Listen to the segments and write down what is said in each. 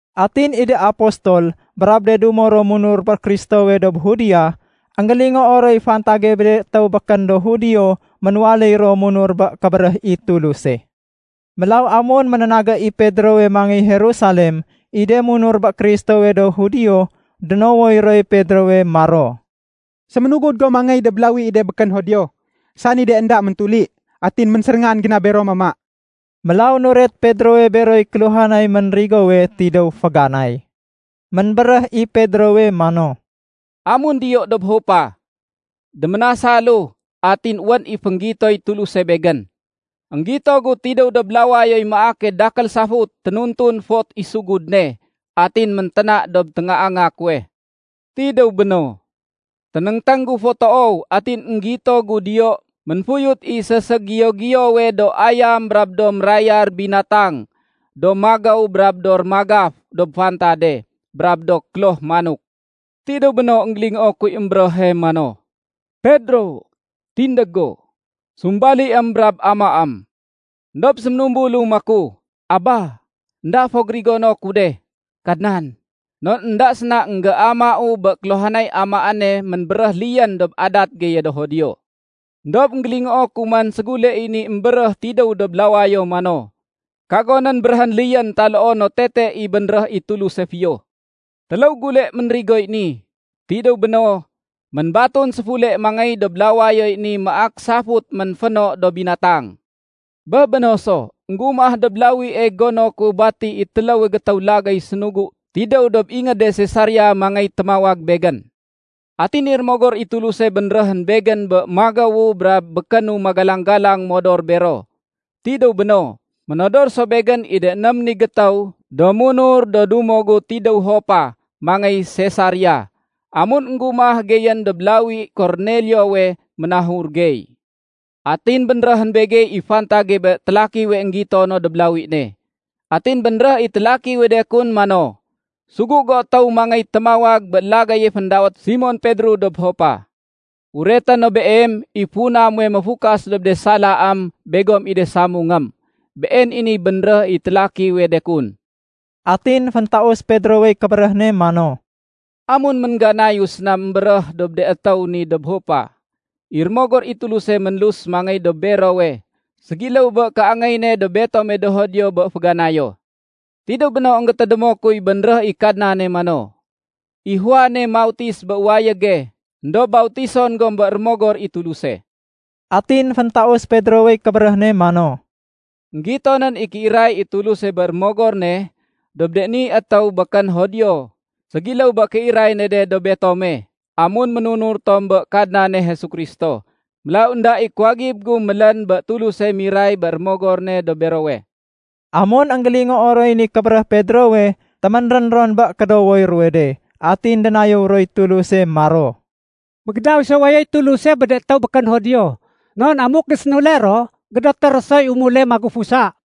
Atin i de apostol brab de dumo ro munur bé Kristowe dob Judea, énggélingoo roy fantage bé de étéw békén do Judio ménwaléy ro munur bé kébéréh i Tuluse. Mélaw amun ménénagé i Pedrowe mangéy Jerusalem, i de munur bé Kristowe do Judio, dénowoy roy Pedrowe, maro, “Séménugud go mangéy dob lawi i de békén Judio, sani de énda méntuli. Atin ménséréngan go na bero mama.” Mélaw nuret Pedrowe beroy kéluhanay ménrigowe tidéw féganay. Ménbéréh i Pedrowe mano, “Amun diyou dob Jopa, déménasalu atin wén i fénggitoy Tuluse begén. Énggito gu tidéw dob lawayoy maake dakél safut ténutun fot i sugud ne. Atin ménténa dob téngaanga kuwe. Tidéw béno, ténéngténg gu fo toow atin énggito gu diyo ménfuyut i séségiyo-giyowe do ayam brab do mérayar binatang do magéw brab do rémagaf dob fantade, brab do kloh manok. Tidéw béno énggélingoo kuy émbéréhe mano, ‘Pedro, tindég go, sumbaliém brab amaém.’ Endob séménumbulu maku, ‘Aba, énda fo gérigono ku de, Kadnan. Non énda séna énggéamau bé kéluhanay amaéne ménbéréh liyén dob adat geye do Judio.’ Endob énggélingoo ku man ségule i ni émbéréh tidéw dob lawayo mano, ‘Kagonén béréhén liyén taloo no tete i bénréh i Tuluse fiyo.’ Téléw gule ménrigoy ni. Tidéw béno, ménbatun séfule mangéy dob lawayoy ni maak safut ménféno do binatang. Bé béno so, énggumah dob lawie gono ku bati i téléwe gétéw lagéy sénugu tidéw dob ingéde Sesaria mangéy témawag begén. Atin i Rémogor i Tuluse bénréhén begén bé magéwu brab békénu magalang-galang modor bero. Tidéw béno, ménodor so begén i de ném ni gétéw do munur do dumo gu tidéw Jopa mangéy Sesaria. Amun énggumah geyén dob lawi Korneliowe, ménahur gey. Atin bénréhén begey i fantage bé télakiwe énggito no dob lawi ne. Atin bénréh i télakiwe de kun mano, ‘Sugu go étéw mangéy témawag bé lagéye féndawét Simon Pedro dob Jopa. Ureté no beem i funa muwe méfukas dob de salaém begom i de samungém.’ Been i niy bénréh i télakiwe de kun.” Atin féntaus Pedrowey kébéréh ne mano, “Amun méngganayu séna émbéréh dob de étéw ni dob Jopa, i Rémogor i Tuluse ménlus mangéy dob berowe ségiléw bé kéangéy ne dob betome do Judio bé féganayo. Tidéw béno énggétédémo kuy bénréh i Kadnane mano, ‘I Juane mautis bé wayége éndob bautison gom bé Rémogor i Tuluse.’” Atin féntaus Pedrowey kébéréh ne mano, “Enggitonén i kéiray i Tuluse bé Rémogor ne dob de ni étéw békén Judio ségiléw bé kéiray ne de dob betome amun ménunur tom bé Kadnane Jesu Kristo. Mélaw énda i kuwagib gu mélén bé Tuluse miray bé Rémogor ne dob berowe.” Amun énggélingoo roy ni kébéréh Pedrowe, téménrén ron bé kédowoy ruwe de. Atin dénayéw roy Tuluse maro, “Mégédaw so wayoy Tuluse bé de étéw békén Judio non amuk gésénule ro, gédoté ro soy umule magufusa.”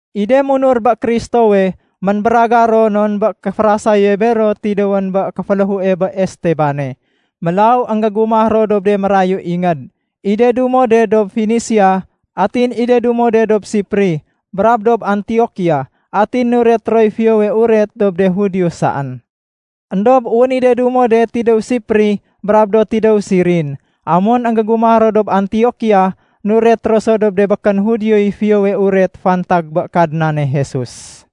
I de munur bé Kristowe ménbéragar ro non bé kéférasaye bero tidéwén bé kéféléhue bé Estebane. Mélaw énggégumah ro dob de mérayu ingéd. I de dumo de dob Fenisia atin i de dumo de dob Sipri brab dob Antiokia. Atin nuret roy Fiyowe Uret dob de Judio saén. Endob wén i de dumo de tidéw Sipri brab do tidéw Sirin, amun énggégumah ro dob Antiokia nuret ro so dob de békén Judioy Fiyowe Uret fantag bé Kadnane Jesus.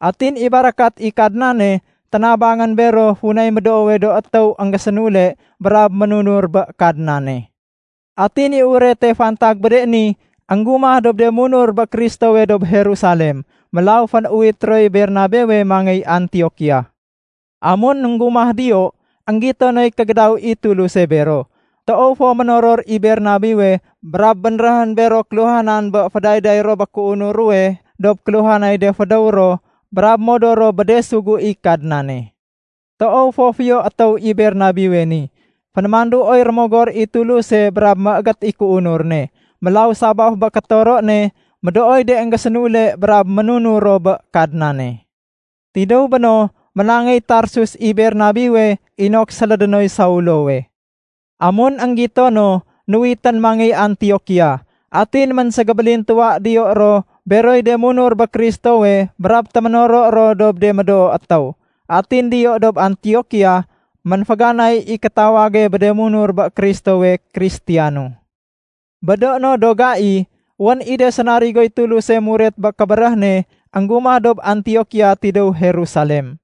Atin i barakat i Kadnane ténabangén bero funay médoowe do étéw énggésénule brab ménunur bé Kadnane. Atin i urete fantag bé de ni énggumah dob de munur bé Kristowe dob Jerusalem. Mélaw fénuwit roy Bernabewe mangéy Antiokia. Amun énggumah diyo, énggito noy kégédaw i Tuluse bero. Toow fo ménoror i Bernabewe brab bénréhén bero kéluhanan bé fédayday ro bé kéunur ruwe dob kéluhanay de fédéw ro brab modor ro bé de sugu i Kadnane. Toow fo fiyo étéw i Bernabewe ni. Fénémanduoy Rémogor i Tuluse brab méégét i kéunur ne. Mélaw sabaf bé kétoro ne, médooy de énggésénule brab ménunur ro bé Kadnane. Tidéw béno, ménangéy Tarsus i Bernabewe inok sélédé noy Saulowe. Amun énggito no, nuwitén mangéy Antiokia. Atin ménségébélintuwa diyo ro beroy de munur bé Kristowe brab téménoro ro dob de médoo étéw. Atin diyo dob Antiokia, ménféganay i kétawage bé de munur bé Kristowe “Kristiyano”. Bé do no do gai, wén i de sénarigoy Tuluse muret bé kébéréh ne énggumah dob Antiokia tidéw Jerusalem.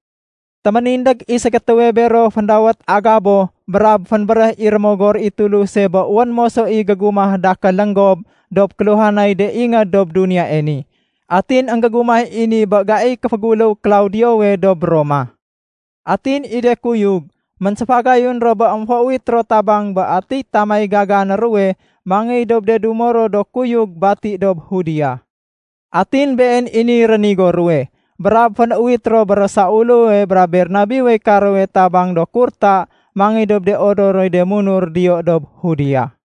Téménindég i ségétéwe bero féndawét Agabo brab fénbéréh i Rémogor i Tuluse bé wén moso i gégumah dakél lénggob dob kéluhanay de ingéd dob duniyae ni. (Atin énggégumah i ni bé gaiy kéféguléw Klaudiowe dob Roma.) Atin i de kuyug, ménséfagayun ro bé émféuwit ro tabang bé atiy tamay gagané ruwe mangéy dob de dumo ro do kuyug bati dob Judea. Atin been i niy rénigo ruwe, brab fénuwit ro bé ro Saulowe brab Bernabewey karowe tabang do kurta mangéy dob de odoroy de munur diyo dob Judea.